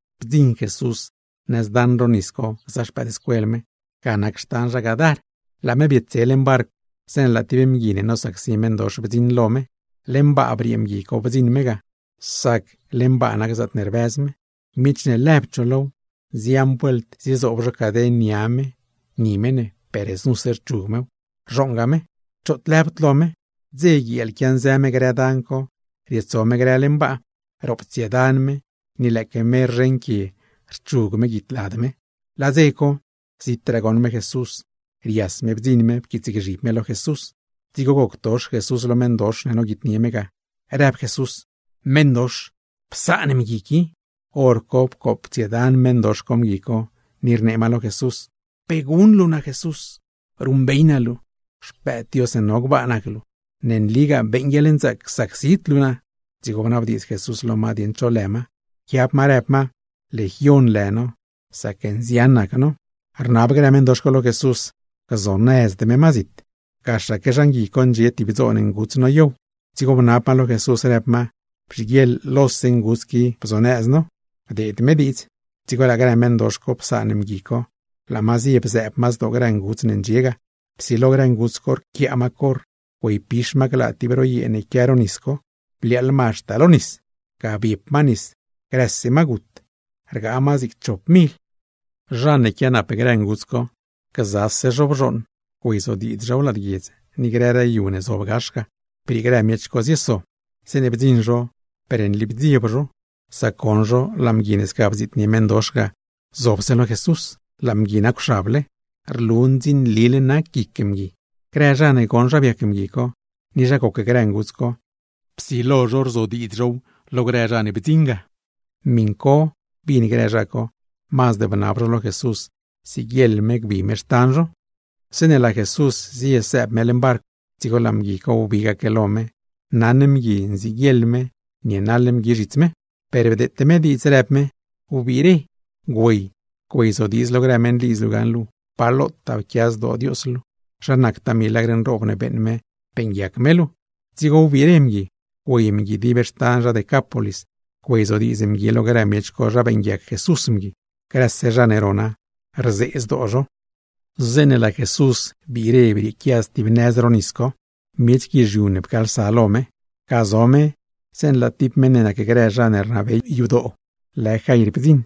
Bdziṉ Jesús nëz daṉ ro nisdoo co gza xpëëdscuel me, ga nac xtan zha Gadar. Laa me bietdze leṉ barcw, zeeṉe laa tib mgui ne nosacsi meṉdox bdziṉ lo me. Leṉ baa briee mgui co bdziṉ me ga, sac leṉ baa nac zaatne rbëz me. Miech ne lëbd zho low, nzian vuelt ziezoob zho caden nia me, ni me ne, per znuse rchug mew, rzhooṉga me. ¡Choot rlëbd lo me! Dze, guieel quianzë me grë dan co, rietso me grë leṉ baa. Roptsiedan me, ni lëëque me rzheṉ quie rchug me guidlad me. Laa dze co, zitraa goṉ me Jesús, rias me bdziṉ me pquiitsgzhib me lo Jesús. Dzigo goctox Jesús lo meṉdox ne noguitnie me, rëb Jesús: ―¡Meṉdox, psaan meṉ qui! Horco pcooptsiedan meṉdox co mgui co, ni rnee ma lo Jesús: ―¿Pe guṉ luu naa Jesús? Ruṉbey naa luu, Xpëëd Dios ne no gbaa nac luu. ¡Ne nlipagaa beeṉ guieḻnzaac csacsid luu naa! Dzigo bnabdiidz Jesús lo ma dieṉ cho lë ma. Pquiab ma rëb ma: ―Legion lë no, sac nzian nac no. Rnab grë meṉdox co lo Jesús, gzonëzd me ma zit. Gaxaque zhan gui co ndxie tib dzoon nguts noyow, dzigo bnab ma lo Jesús, rëb ma: ―Bzhiguieḻ lose grë nguts qui bzonëz no. Bdeed Jesús diidz. Dzigo laa grë meṉdox co psaan mgui co, laa ma zie bzëëb ma zdoo grë nguts ne ndxie ga; psilo grë nguts co rquiaa ma corr güeypix ma glaa tib ro yee ne quia ro nisdoo co, bliaaḻ ma haxta lo nis. Ga biep ma nis, grëse ma gut. Rgaa ma zig chop mil. Zha ne quianap grë nguts co, gzase zho bzhooṉ güeyzodiidz zhow lad guiedz, ni grëraa yu ne zob gax ga. Briee grë miech co, zieso zho. Zeeṉe bdziṉ zho, per nli bdzieb zho, sac goṉ zho laa mgui ne sca bdziitnie meṉdox ga zobse lo Jesús, laa mgui nacwxable, rlu ndzinlile nac guic mgui. Psilo grë zha ne goṉ zha biac mgui co, ni zha goc grë nguts co, psilo zho rzodiidz zhow lo grë zha ne bdziṉ ga. Miṉ co bin grë zha co, mazd bnab zho lo Jesús siguieḻ me gbi me xtan zho. Zeeṉe laa Jesús zie sëëb me leṉ barcw, dzigo laa mgui co wbigaque lo me, naṉ mgui nziguieḻ me nienaḻ mgui zhits me. Per bdeete me diidz, rëb me: ―Wbire, güey güeyzodiidz lo grë meṉlidz luu gaṉle pa lotaa pquia zdoo Dios luu, zha nactaa milagr nroob ne beeṉ me beeṉguiac me luu. Dzigo wbire mgui. Güey mgui dib xtan zha Decápolis, güeyzodiidz mgui lo grë miech co zha beeṉguiac Jesús mgui. Grëse zha ne rona, rzee zdoo zho. Zeeṉe laa Jesús biire brieequia stib nëz ro nisdoo co, miech guizhiu ne pcaalsa lo me ga. Ga zo me zeeṉe laa tib meṉ ne nacgrë zha ne rnabey yadoo lë Jair bdziṉ.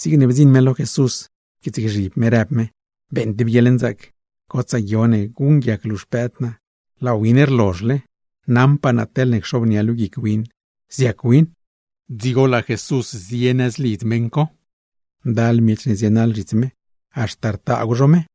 Zigne bdziṉ me lo Jesús pquiitsgzhib me, rëb me: ―Beeṉ tib guieḻnzaac gotsaa guio ne guṉguiac luu xpëëd naa. Laa win rlozhle; naṉpaa naa teḻne cxobnia luu guic win, ziac win. Dzigo laa Jesús zie nëz lidz meṉ co. Ndal miech ne zienaḻ zhits me, haxta rtaagw zho me.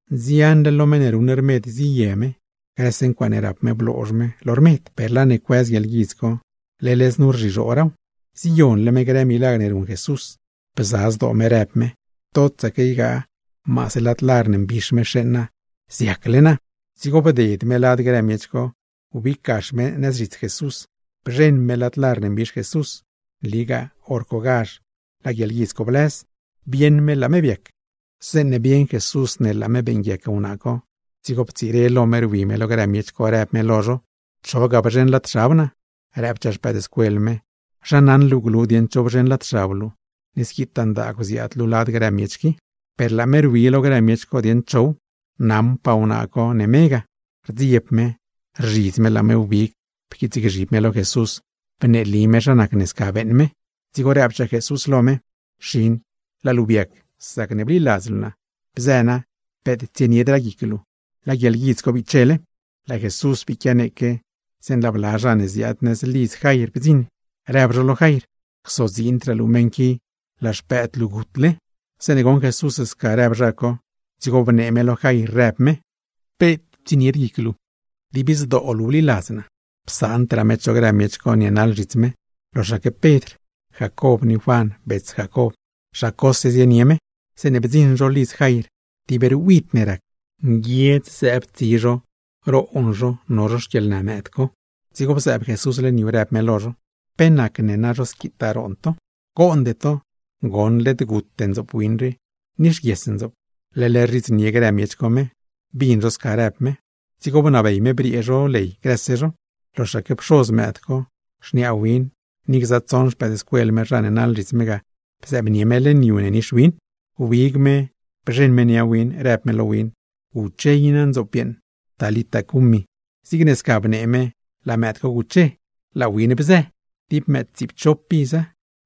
Nzianle lo meṉ ne ruṉ rmed ziye me, grëse ncuaaṉe rap me bloozh me lo rmed; per laa ne cuëz guieḻguidz co, leḻ znu rzhizhooraaw. Ziyonle me grë milagr ne ruṉ Jesús. Bza zdoo me rëb me: “Totsaque ygaa maase lad lar ne mbix me xeeṉ naa, ziacle naa.” Dzigo bded me lad grë miech co, wbig gax me nëz zhits Jesús, bzheṉ me lad lar ne mbix Jesús. Nligaa hor cogazh laa guieḻguidz co blëz, bieṉ me laa me biac. Zeeṉe bieṉ Jesús ne laa me beeṉguiac wnaa co, dzigo ptsire lo me rwi me lo grë miech co, rëb me lo zho: ―¿Cho ga bzheṉ lad xab naa? Rëbchaa xpëëdscuel me: ―¿Zha naṉ luu glu dieṉ cho bzheṉ lad xab luu, ni squitaa ndaagw ziaad luu lad grë miech qui? Per laa me rwi lo grë miech co dieṉ chow. Naṉpaa wnaa co ne me ga, rdzieb me, rzhidz me laa me wbig pquiitsgzhib me lo Jesús bneeli me zha nacne sca beeṉ me. Dzigo rëbchaa Jesús lo me: ―Xin, laa luu biac sacne bliladz luu naa. Bzë na, peet tsieniedraa guic luu, laa guieḻguidz co bichele. Laa Jesús bii quianeeque, zeeṉe laa bla zha ne ziaad nëz lidz Jair bdziṉ, rëb zho lo Jair: ―Csodziindraa luu lo meṉ qui, laa xpëëd luu gutle. Zeeṉe goṉ Jesús sca rëb zha co, dzigo bnee me lo Jair rëb me: ―Peet tsienied guic luu. Dib zdoo luu bliladz naa. Psaandraa me cho grë miech co nienaḻ zhits me, loxaque Pedr, Jacob ni Juan bets Jacob; zha cose zienie me. Zeeṉe bdziṉ zho lidz meṉ co, tib ruid ne rac, nguiedz zëëb tsi zho roon zho no zho xquieḻnë mëëd co. Dzigo bzëëb Jesús leṉ yu, rëb me lo zho: ―¿Pe nacne squitaa roon to? Goonde to, goṉ led gute ndzoop win rii, nixguies ndzoop. Leḻ rzhidznie grë miech co me, bin zho sca rëb me. Dzigo bnabey me briee zho ley grëse zho, loxaque pxoz mëëd co, xniaa win ni gza tsoṉ xpëëdscuel me zha ne naḻ zhits me ga bzëëbnie me leṉ yu ne nix win. Wbig me bzheṉ me nia win, rëb me lo win: ―¡Guche i na, ndzoop yeeṉ! (Talita, cumi.) Zigne sca bnee me laa mëëd co guche, laa win bzë. Tib mëëd tsiipchop iza.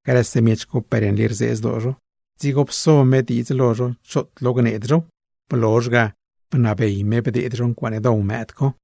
Grëse miech co per nli rzee zdoo zho. Dzigo pso me diidz lo zho choot lo gneed zhow; blozh ga bnabey me bdeed zho ncuaaṉe dow mëëd co.